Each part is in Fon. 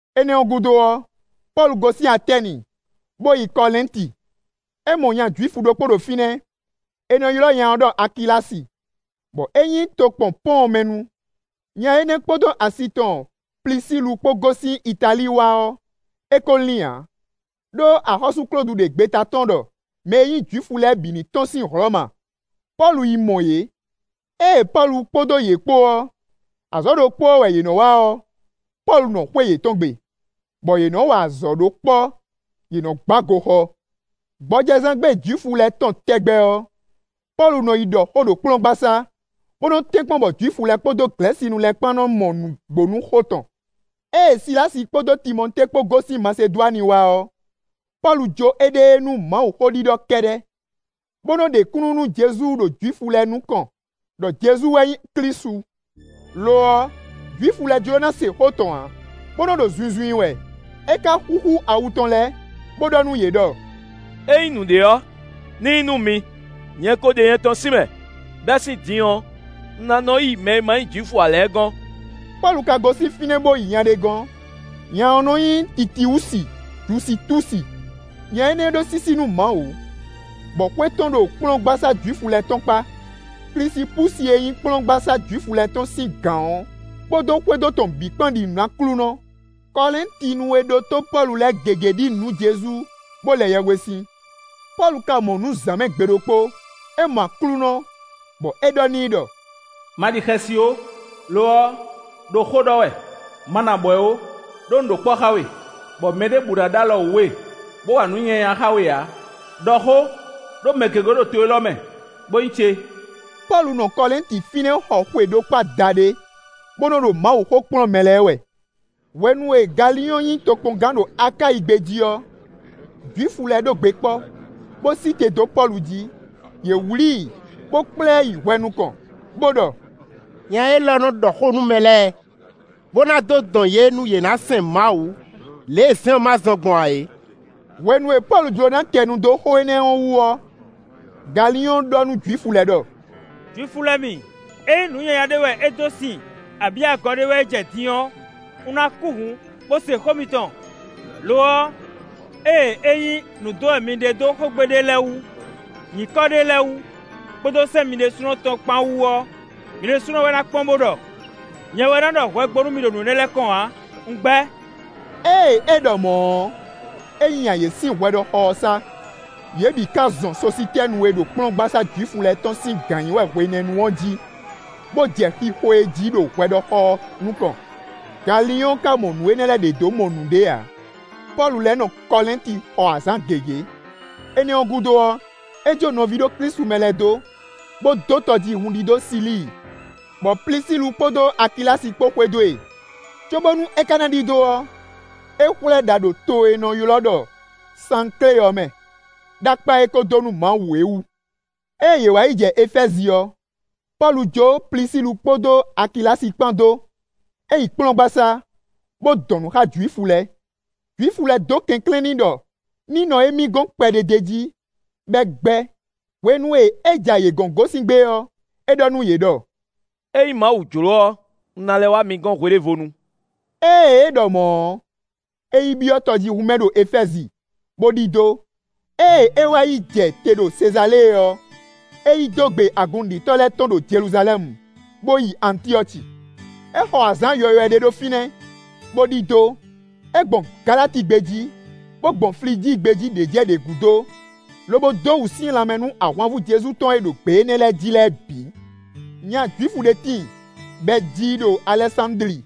Énɛ́ ɔ́ gúdo ɔ́, Pɔ́lu gosín Atɛ́ni, bó yi Kɔlɛ́nti. É mɔ nya Jwifu ɖokpó ɖo fínɛ́; è nɔ ylɔ́ nya ɔ́ ɖɔ Akilási, bɔ é nyí tokpɔn Pɔ́ɔn mɛ nu; nya énɛ́ kpódó asi tɔn Plisílu kpó gosín Italíi wá ɔ́, é ko lín ǎ, ɖó axɔ́sú Klódu ɖe gbeta tɔ́n ɖɔ mɛ e nyí Jwifu lɛ́ɛ bǐ ní tɔ́n sín Hlɔ̌ma; Pɔ́lu yi mɔ yě. Ée Pɔ́lu kpódó yě kpó ɔ́, azɔ̌ ɖokpó ɔ́ wɛ yě nɔ́ wa ɔ́, Pɔ́lu nɔ xwé yětɔn gbe, bɔ yě nɔ́ wa azɔ̌ ɖó kpɔ́ yě nɔ́ gbá goxɔ. Gbɔjɛzán gbe Jwifu lɛ́ɛ tɔn tɛgbɛ ɔ́, Pɔ́lu nɔ yi ɖɔ xó ɖo kplɔ́ngbasá, bó nɔ́ tɛ́nkpɔ́n bɔ Jwifu lɛ́ɛ kpódó Glɛ̌sinu lɛ́ɛ kpán nɔ mɔ nǔgbó nú xó tɔn. Ée Silási kpódó Timɔtée kpó gosín Masedwani wá ɔ́, Pɔ́lu jó éɖée nú Mawuxó ɖiɖɔ kɛ́ɖɛ́, bó nɔ́ ɖe kúnnu nú Jezu ɖo Jwifu lɛ́ɛ nukɔn ɖɔ Jezu wɛ nyí Klísu; lo ɔ́, Jwifu lɛ́ɛ jló ná se xó tɔn ǎ, bó nɔ́ ɖo zunzun i wɛ; é ka xúxú awu tɔn lɛ́ɛ, bó ɖɔ nú yě ɖɔ: “Ényí nǔɖé ɔ́, ní nyí nú mi; nyɛ ko ɖe nyɛtɔn sín mɛ. Bɛ́ sín din ɔ́, un ná nɔ́ yi mɛ e ma nyí Jwifu ǎ lɛ́ɛ gɔ́n.” Pɔ́lu ka gosín fínɛ́ bó yi nya ɖé gɔ́n; nya ɔ́ nɔ nyí Titiwusi-Jusitúsi. Nya énɛ́ ɖó sísí nú Mawu, bɔ xwé tɔn ɖo kplɔ́ngbasá Jwifu lɛ́ɛ tɔn kpá. Klisipúsi e nyí kplɔ́ngbasá Jwifu lɛ́ɛ tɔn sín gǎn ɔ́ kpódó xwédo tɔn bǐ kpán ɖi nǔ nú Aklúnɔ. Kɔlɛ́ntinu e ɖótó Pɔ́lu lɛ́ɛ gěgé ɖi nǔ nú Jezu, bó lɛ yɛhwesin. Pɔ́lu ka mɔ nǔ zǎn mɛ gbe ɖokpó; é mɔ Aklúnɔ, bɔ é ɖɔ n'i ɖɔ: “Ma ɖi xɛsi ó; lo ɔ́, ɖo xó ɖɔ wɛ; ma nɔ abwɛ̌ ó; ɖó un ɖo kpɔ́ xá we, bɔ mɛ ɖěbǔ ná ɖó alɔ wú we, bó wa nǔ nyanya xá we ǎ; ɖɔ xó, ɖó mɛ gěgé ɖo to élɔ́ mɛ, bó nyí ce.” Pɔ́lu nɔ Kɔlɛ́nti fínɛ́ xɔ xwe ɖokpó adaɖé, bó nɔ́ ɖo Mawuxó kplɔ́n mɛ lɛ́ɛ wɛ. Hwenu e Galiɔ́ɔn nyí tokpɔngán ɖo Akáyi gbé jí ɔ́, Jwifu lɛ́ɛ ɖó gbe kpɔ́, bó sí te dó Pɔ́lu jí; yě wlǐ i, bó kplá ɛ yi hwɛ nukɔn, bó ɖɔ: “Nya élɔ́ nɔ́ ɖɔ xó nú mɛ lɛ́ɛ, bó ná dó dɔn yě nú yě ná sɛn Mawu lě e sɛ́n ɔ́ ma zɔ́n gbɔn ǎ é.” Hwenu e Pɔ́lu jló ná kɛ nu dó xó énɛ́ ɔ́ wú ɔ́, Galiɔ́ɔn ɖɔ nú Jwifu lɛ́ɛ ɖɔ: “Jwifu lɛ́ɛ mi; ényí nǔ nyanya ɖé wɛ é dó sin abǐ agɔ ɖé wɛ é jɛ din ɔ́, un ná kú hǔn, bó se xó mitɔn. Lo ɔ́, ée ényí nǔ dɔn wɛ mi ɖe dó xógbe ɖé lɛ́ɛ wú, nyǐkɔ ɖé lɛ́ɛ wú, kpódó sɛ́n mi ɖésúnɔ tɔn kpán wú ɔ́, mi ɖésúnɔ wɛ ná kpɔ́n bó ɖɔ. Nyɛ wɛ ná ɖɔ hwɛ gbo nú mi ɖo nǔ énɛ́ lɛ́ɛ kɔn ǎ; un gbɛ́.” Ée é ɖɔ mɔ̌ ɔ́, é nya yě sín hwɛɖɔxɔ ɔ́ sá. Yě bǐ ka zɔn Sositɛ́nu e ɖo kplɔ́ngbasá Jwifu lɛ́ɛ tɔn sín gǎn nyí wɛ hwenɛ́nu ɔ́ jí, bó jɛ xixo e jí ɖo hwɛɖɔxɔ ɔ́ nukɔn. Galiɔ́ɔn ka mɔ nǔ énɛ́ lɛ́ɛ ɖě dó mɔ nǔɖé ǎ. Pɔ́lu lɛ́ nɔ Kɔlɛ́nti xɔ azǎn gěgé; énɛ́ ɔ́ gúdo ɔ́, é jó nɔví ɖo Klísu mɛ lɛ́ɛ dó, bó dó tɔjíhún ɖidó Silíi, bɔ Plisílu kpódó Akilási kpó xwedó e; cóbónú é ka ná ɖidó ɔ́, é xwlɛ́ ɖa ɖo to e è nɔ ylɔ́ ɖɔ Sanklé ɔ́ mɛ, ɖó akpá e é kó dó nú Mawu é wú. Ée yě wá yi jɛ Efɛ́zi ɔ́, Pɔ́lu jó Plisílu kpódó Akilási kpán dó; é yi kplɔ́ngbasá, bó dɔn nǔ xá Jwifu lɛ́ɛ. Jwifu lɛ́ɛ dó kɛnklɛ́n n'i ɖɔ ní nɔ émí gɔ́n kpɛɖé d'é jí, bɔ é gbɛ́. Hwenu e é ja yě gɔ̌n gosín gbé ɔ́, é ɖɔ nú yě ɖɔ: “Ényí Mawu jló ɔ́, un ná lɛ́ wá mi gɔ́n hwe ɖěvo nu.” Ée é ɖɔ mɔ̌ ɔ́, é yi byɔ́ tɔjíhún mɛ ɖo Efɛ́zi, bó ɖidó. Ée é wá yi jɛ te ɖo Sezalée ɔ́, é yi dó gbe agun nǔɖitɔ́ lɛ́ɛ tɔn ɖo Jeluzalɛ́mu, bó yi Antyɔ́ci. É xɔ azǎn yɔywɛ ɖé ɖo fínɛ́, bó ɖidó. É gbɔn Galati gbé jí, bó gbɔn Flijíi gbé jí ɖě jɛ ɖě gúdo, lobo dó wǔsyɛ́n lanmɛ nú ahwanvú Jezu tɔn e ɖo gbě énɛ́ lɛ́ɛ jí lɛ́ɛ bǐ. Nya Jwifu ɖé tíin, bɔ è ji i ɖo Alɛsándli;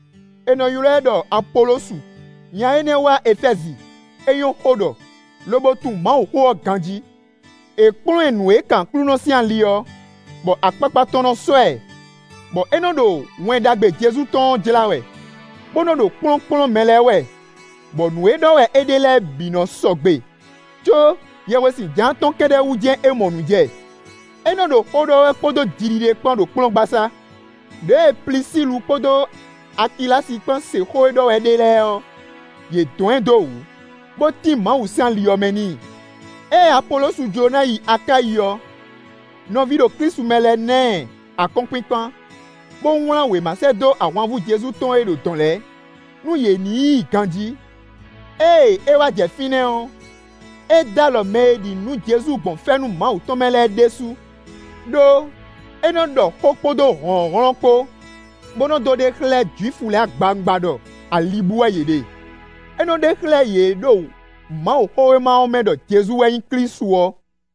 è nɔ ylɔ́ ɛ ɖɔ Apolosu; nya énɛ́ wá Efɛ́zi; é nyɔ́ xó ɖɔ, lobo tunwun Mawuxó ɔ́ ganjí. È kplɔ́n ɛ nǔ e kan Aklúnɔ sín ali ɔ́, bɔ akpakpa tɔn nɔ sɔ́ ɛ, bɔ é nɔ́ ɖo Wɛn Ɖagbe Jezu tɔn ɔ́ jlá wɛ, bó nɔ́ ɖo kplɔ́nkplɔ́n mɛ lɛ́ɛ wɛ, bɔ nǔ e ɖɔ wɛ é ɖe lɛ́ɛ bǐ nɔ́ sɔgbe, có yɛhwesin Jǎan tɔn kɛ́ɖɛ́ wú jɛ́n é mɔ nǔ jɛ. É nɔ ɖo xó ɖɔ wɛ kpódó jiɖiɖe kpán ɖo kplɔ́ngbasá. Đěe Plisílu kpódó Akilási kpán se xó e ɖɔ wɛ é ɖe lɛ́ɛ ɔ́, yě dɔn ɛ dó wǔ, bó tín Mawu sín ali ɔ́ mɛ n'i. Ée Apolosu jló ná yi Akáyi ɔ́, nɔví ɖo Klísu mɛ lɛ́ɛ na ɛ akɔ́nkpinkpan, bó wlán wěma sɛ́ dó ahwanvú Jezu tɔn e ɖo dɔ̌n lɛ́ɛ, nú yě ní yí i ganjí. Ée é wá jɛ fínɛ́ ɔ́, é dó alɔ mɛ e ɖi nǔ nú Jezu gbɔn fɛ́nú Mawu tɔn mɛ lɛ́ɛ ɖésú. Đó, é nɔ ɖɔ xó kpódó hlɔ̌nhlɔ́n kpó, bó nɔ dó ɖe xlɛ́ Jwifu lɛ́ɛ agbawungba ɖɔ ali bú wɛ yě ɖe. É nɔ ɖe xlɛ́ yě ɖo Mawuxówéma ɔ́ mɛ ɖɔ Jezu wɛ nyí Klísu ɔ́.